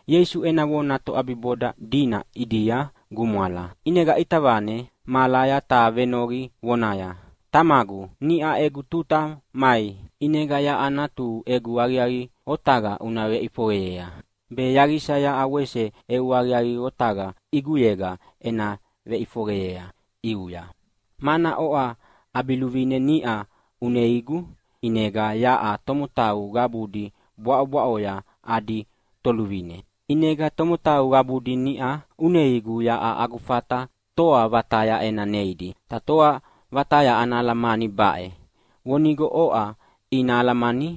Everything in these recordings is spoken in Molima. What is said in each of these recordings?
Ieisu ena vona toʼabiboda dina ʼidia gumwala, ʼinega ʼita vane mahalaya ta venoqi vonaya, “Tamagu, niʼa egu tuta mai. ʼInega yaʼa Natuhu egu aqiaqi otaqa una veʼifoqeyea, be yaqisa yaʼa wese eu aqiaqi otaqa ʼiguyega ena veʼifoqeyea ʼiuya. Mana oʼa ʼabiluvine niʼa uneigu ʼinega yaʼa tomotau qabudi bwaʼobwaʼoya adi Toluvine. ʼInega tomotau qabudi niʼa uneigu yaʼa agu fata toa vataya ena neidi. Ta toa vataya ana alamani baʼe: Vonigo oʼa ina alamani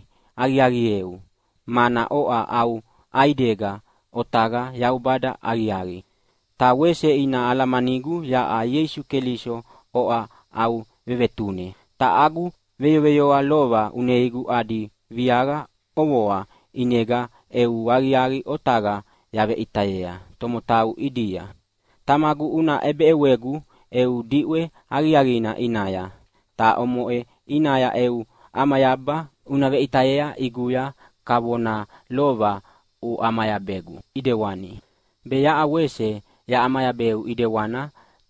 aqiaqieu, mana oʼa au ʼaidega otaqa Yaubada aqiaqi. Ta wese ina alamanigu yaʼa Ieisu Keliso oʼa au vevetune. Ta agu veyoveyoa lova uneigu adi viaqa ʼovoa ʼinega eu aqiaqi otaqa yaveʼitayea tomotau ʼidia. Tamagu, una ʼebeʼewegu eu diʼwe aqiaqina ʼinaya, ta omoʼe ʼinaya eu ʼamayaba una veʼitayea ʼiguya kavona lova uʼamayabegu ʼidewani, be yaʼa wese yaʼamayabeu ʼidewani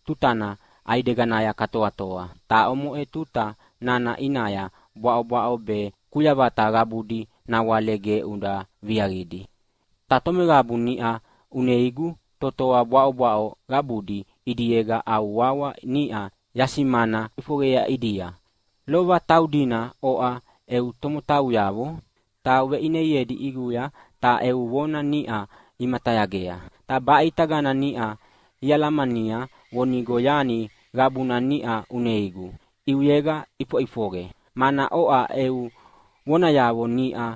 tutana ʼaideganaya katoatoa. Ta omoʼe tuta nana ʼinaya bwaʼobwaʼo be kuyavata qabudi nawale ge uda viaqidi. “Ta tomeqabu niʼa uneigu totoa bwaʼobwaʼo qabudi ʼidiega au wawa niʼa yasimana ʼifoqeyea ʼidia. Lova taudina oʼa eu tomotauyavo, ta uveʼineiedi ʼiguya ta eu vona niʼa imatayagea. Ta baʼitagana niʼa ialamania vonigo yani qabuna niʼa uneigu ʼiuyega ʼifoʼifoqe, mana oʼa eu vonayavo niʼa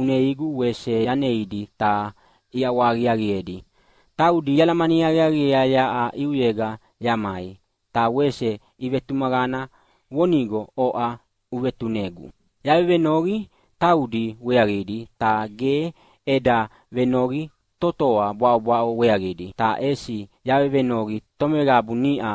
uneigu wese yaneidi ta iʼawahaqiaqiedi. Taudi ialamani aqiaqiea yaʼa ʼiuyega yamai, ta wese ivetumaqana vonigo oʼa uvetunegu. “Yavevenoqi taudi weaqidi, ta ge eda vevenoqi totoa bwaʼobwaʼo weaqidi, ta ʼesi yavevenoqi tomeqabu niʼa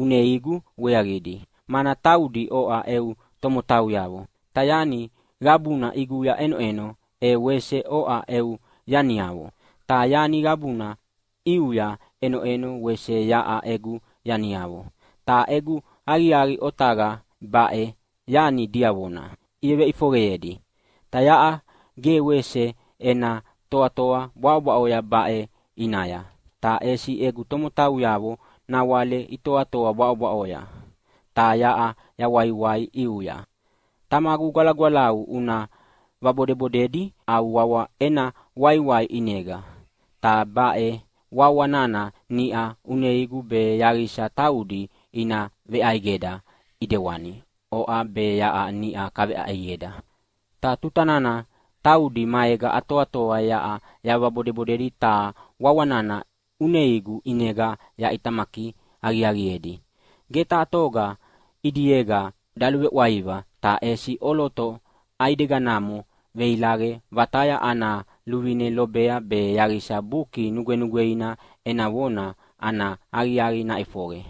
uneigu weaqidi, mana taudi oʼa eu tomotauyavo. Ta yani qabuna ʼiguya ʼenoʼeno e wese oʼa eu yaniavo, ta yani qabuna ʼiuya ʼenoʼeno wese yaʼa egu yaniavo. Ta egu aqiaqi otaqa baʼe yani diavona iveveʼifoqeyea. Yaʼa ge wese ena toatoa bwaʼobwaʼo baʼe ʼinaya, ta ʼesi egu tomotauyavo nawale itoatoa bwaʼobwaʼoya, ta yaʼa yawaiwai ʼiuya. Tamagu Gwalagwalau, una vabodebodedi au wawa ena waiwai ʼinega, ta baʼe wawa nana niʼa uneigu be yaqisa taudi ina veʼaidega ʼidewani oʼa be yaʼa niʼa kaveʼaidega. Ta tuta nana taudi maega atoatoa yaʼa yavabodebodedi ta wawa nana uneigu ʼinega yaʼitamaki aqiaqiedi. Ge taha toga ʼidiega daluveʼwaiva, ta ʼesi ʼoloto ʼaideganamo veilaqe vataya ana luvine lobea be yaqisa Buki Nugwenugweina ena vona ana aqiaqi naʼifoqe.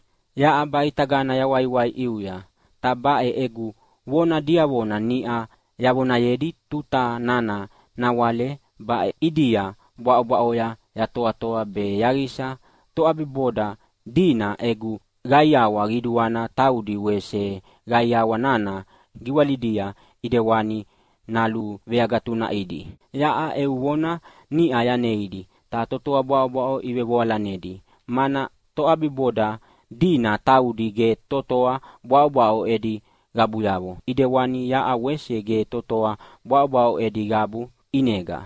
“Yaʼa baʼitagana yawaiwai ʼiuya, ta baʼe egu vona diavona niʼa yavonayedi tuta nana nawale baʼidia bwaʼobwaʼoya yatoatoa, be yaqisa toʼabiboda dina egu qaiawa qiduana taudi wese qaiawa nana giwalidia ʼidewani naluveagatunaʼidi. Yaʼa eu vona niʼa yaneidi, ta totoa bwaʼobwaʼo ivevoalanedi, mana toʼabiboda dina taudi ge totoa bwaʼobwaʼo edi qabuyavo ʼidewani yaʼa wese ge totoa bwaʼobwaʼo edi qabu ʼinega.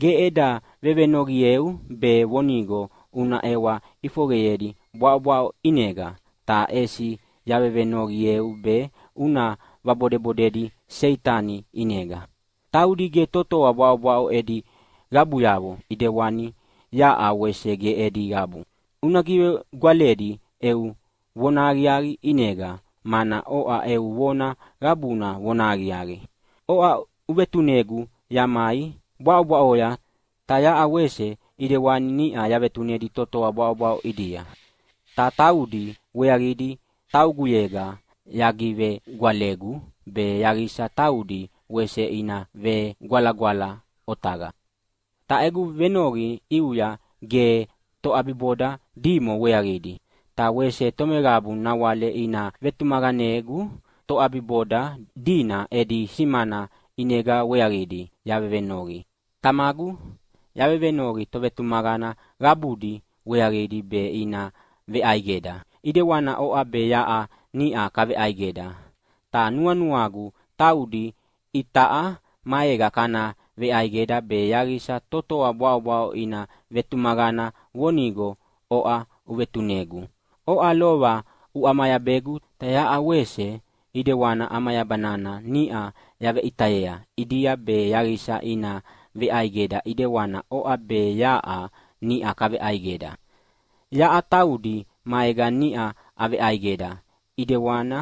Ge eda vevenoqieu be vonigo una ʼewa ʼifoqeyedi bwaʼobwaʼo ʼinega, ta ʼesi yavevenoqieu be una vabodebodedi Seitani ʼinega. Taudi ge totoa bwaʼobwaʼo edi qabuyavo, ʼidewani yaʼa wese ge edi qabu. Una givegwaledi eu vonahaqiaqi ʼinega, mana oʼa eu vona qabuna vonahaqiaqi. Oʼa uvetunegu yamai bwaʼobwaʼoya, ta yaʼa wese ʼidewani niʼa yavetunedi totoa bwaʼobwaʼo ʼidia. Ta taudi weaqidi tauguyega yagivegwalegu be yaqisa taudi wese ina vegwalagwala otaqa. “Ta egu venoqi ʼiuya ge toʼabiboda dimo weaqidi. Ta wese tomeqabu nawale ina vetumaqanegu toʼabiboda dina edi simana ʼinega weaqidi yavevenoqi. Tamagu, yavevenoqi tovetumaqana qabudi weaqidi be ina veʼaidega, ʼidewani oʼa be yaʼa niʼa kaveʼaidega. Ta nuanuagu taudi itaʼa maega kana veʼaidega be yaqisa totoa bwaʼobwaʼo ina vetumaqana vonigo oʼa uvetunegu. Oʼa lova uʼamayabegu, ta yaʼa wese ʼidewani ʼamayaba nana niʼa yaveʼitayea ʼidia be yaqisa ina veʼaidega ʼidewani oʼa be yaʼa niʼa kaveʼaidega. Yaʼa taudi maega niʼa aveʼaidega, ʼidewani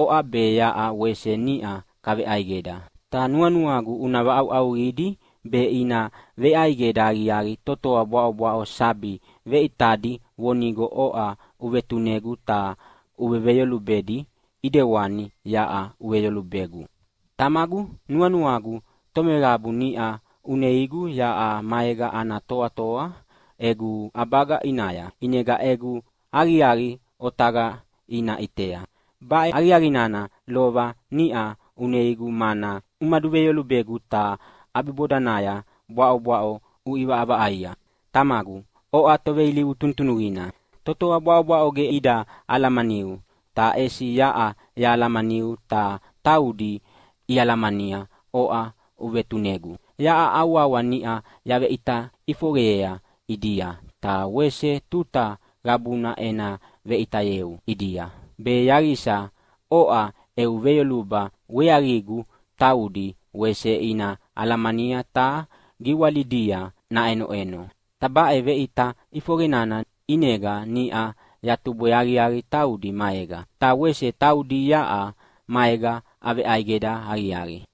oʼa be yaʼa wese niʼa kaveʼaidega. Ta nuanuagu una vaʼauʼauqidi be ina veʼaidega aqiaqi totoa bwaʼobwaʼo sabi veʼitadi vonigo oʼa uvetunegu ta uveveyolubedi ʼidewani yaʼa uveveyolubegu. “Tamagu, nuanuagu tomeqabu niʼa uneigu yaʼa maega ana toatoa egu ʼabaga ʼinaya, ʼinega egu aqiaqi otaqa ina ʼitea. Baʼe aqiaqi nana lova niʼa uneigu mana umaduveyolubegu, ta ʼabibodanaya bwaʼobwaʼo uʼivaʼavaʼaia. Tamagu, oʼa toveilivu tunutunuqina! Totoa bwaʼobwaʼo ge ida alamaniu, ta ʼesi yaʼa yahalamaniu, ta taudi ialamania oʼa uvetunegu. Yaʼa au wawa niʼa yaveʼita ʼifoqeyea ʼidia, ta wese tuta qabuna ena veveʼitayeu ʼidia, be yaqisa oʼa eu veyoluba weaqigu taudi wese ina alamania ta giwalidia naʼenoʼeno. Ta baʼe veʼita ʼifoqe nana ʼinega niʼa yatubwe aqiaqi taudi maega, ta wese taudi yaʼa maega aveʼaidega aqiaqi.”